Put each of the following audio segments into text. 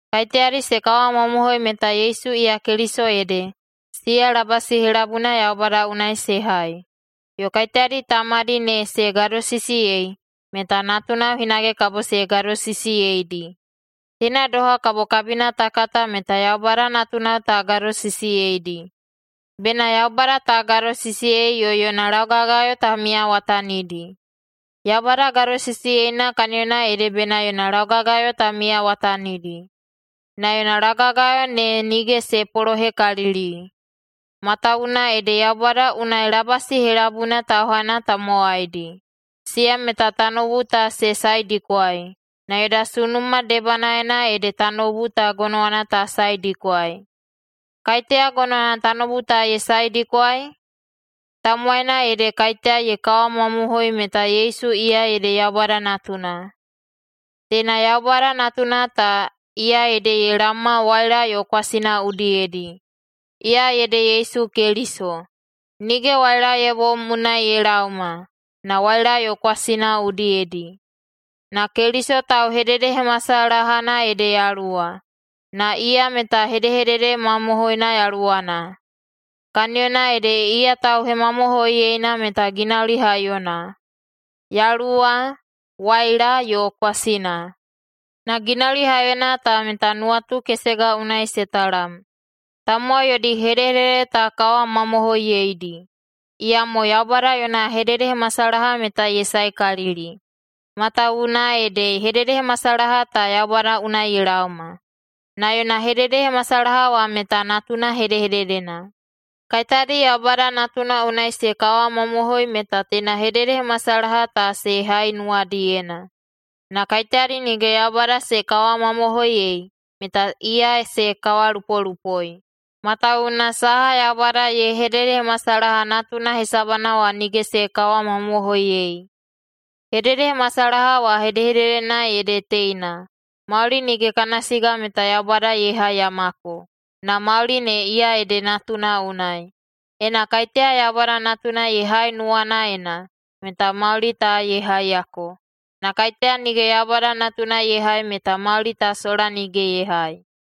Kaiteyadi se kawamamohoi meta Yesu iya Keliso ede, siya labasi helabuina Yaubada unai se hai. Yo kaiteyadi Tamadi ne se gadosisiyei, meta natunao hinage kabo se gadosisiyeidi. Teina doha kabo kabina ta kata meta Yaubada natunao ta gadosisiyeidi: Bena Yaubada ta gadosisiyei yo yona laugagayo ta miyawatanidi. Yaubada gadosisiyeina kaniyona ede bena yona laugagayo ta miyawatanidi. Na yona laugagayo ne nige se polohekalili, matawuwuna ede Yaubada unai labasi helabuina tauhaina tamowaidi, siya meta tanoubu ta se saedikwai, na yoda sunuma debanaena ede tanoubu ta gonowana ta saedikwai. Kaiteya gonowana tanoubu ta ye saedikwai? Tamowaina ede kaiteya ye kawamamohoi meta Yesu iya ede Yaubada Natuna. Teina Yaubada Natuna ta, iya ede ye laoma waila yo kwasina udiyedi. Iya ede Yesu Keliso. Nige waila ye bom unai ye laoma, na waila yo kwasina udiyedi. Na Keliso tauhededehemasalahana ede Yaluwa, na iya meta hedehedede mamohoina Yaluwana. Kaniyona ede iya tauhemamohoiyeina meta ginauli haiyona: Yaluwa, waila, yo kwasina. Na ginauli haiyona ta meta nuwatu kesega unai se talam. Tamowai yodi hedehedede ta kawamamohoiyeidi, iyamo Yaubada yona hededehemasalaha meta ye saekalili, matawuwuna ede hededehemasalaha ta Yaubada unai ye laoma. Na yona hededehemasalaha wa meta Natuna hedehededena. Kaiteyadi Yaubada Natuna unai se kawamamohoi meta teina hededehemasalaha ta se hai nuwadiyena. Na kaiteyadi nige Yaubada se kawamamohoiyei, meta iya se kawalupolupoi, matawuwuna saha Yaubada ye hededehemasalaha Natuna hesabana wa nige se kawamamohoiyei. Hededehemasalaha wa hedehededena ede teina: Mauli nige kana siga meta Yaubada ye haiyamako, na mauli ne iya ede Natuna unai. Ena kaiteya Yaubada Natuna ye hai nuwanaena, meta mauli ta ye haiyako. Na kaiteya nige Yaubada Natuna ye hai meta mauli ta sola nige ye hai.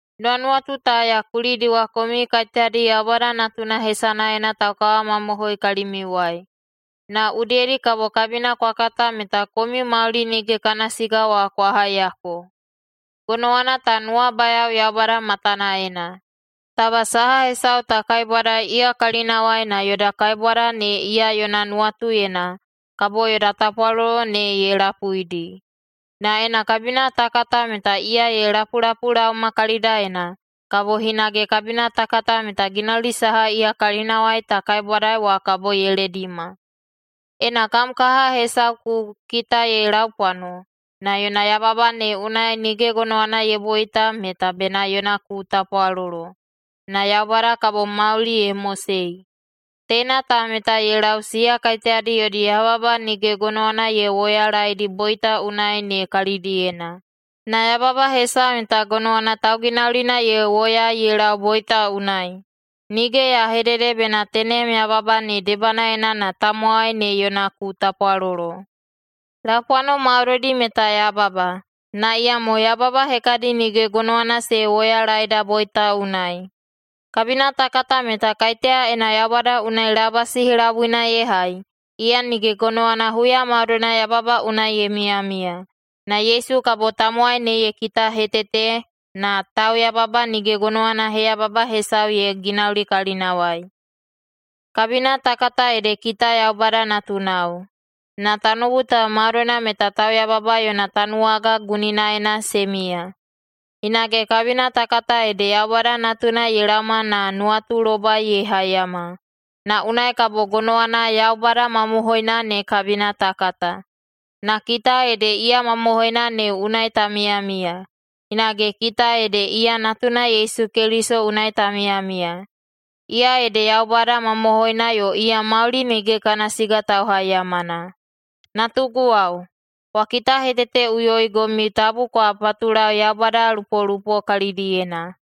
Nuwanuwatu ta ya kulidiwa komiu kaiteyadi Yaubada Natuna hesanaena taukawamamohoi kalimiuwai, na udiyedi kabo kabina kwa kata meta komiu mauli nige kana siga wa kwa haiyako. Gonowana ta nuwabayao Yaubada matanaena. Taba saha hesau ta kaibwadai iya kalinawai na yoda kaibwada ne iya yona nuwatuyena, kabo yoda tapwalolo ne ye lapuidi. Na ena kabina ta kata meta iya ye lapulapulaoma kalidaena, kabo hinage kabina ta kata meta ginauli saha iya kalinawai ta kaibwadai wa kabo ye ledima. Ena kam kaha hesau ku kita ye laupwano, na yona yababa ne unai nige gonowana ye boita, meta bena yona ku tapwalolo, na Yaubada kabo mauli ye mosei. Teina ta meta ye lau siya kaiteyadi yodi yababa nige gonowana ye woyalaeidi boita unai ne kalidiyena. Na yababa hesau meta gonowana tauginaulina ye woyaei ye lau boita unai. Nige ya hedede bena tenem yababa ne debanaena na tamowai ne yona ku tapwalolo. Laupwano maudoidi meta yababa, na iyamo yababa hekadi nige gonowana se woyalaeda boita unai. Kabina ta kata meta kaiteya ena Yaubada unai labasi helabuina ye hai, iya nige gonowana huya maudoina yababa unai ye miyamiya. Na Yesu kabo tamowai ne ye kitahetete, na tauyababa nige gonowana heyababa hesau ye ginauli kalinawai. Kabina ta kata ede kita Yaubada natunao, na tanoubu ta maudoina meta tauyababa yona tanuwaga guninaena se miya. Hinage kabina ta kata ede Yaubada Natuna ye laoma na nuwatulobai ye haiyama, na unai kabo gonowana Yaubada mamohoina ne kabina ta kata. Na kita ede iya mamohoina ne unai ta miyamiya, hinage kita ede iya Natuna Yesu Keliso unai ta miyamiya. Iya ede Yaubada mamohoina yo iya mauli nige kana siga tauhaiyamana. Natuguwao, kwa kitaheteteꞌuyoigomiu tabu kwa patulau yaubadalupolupo kalidiyena!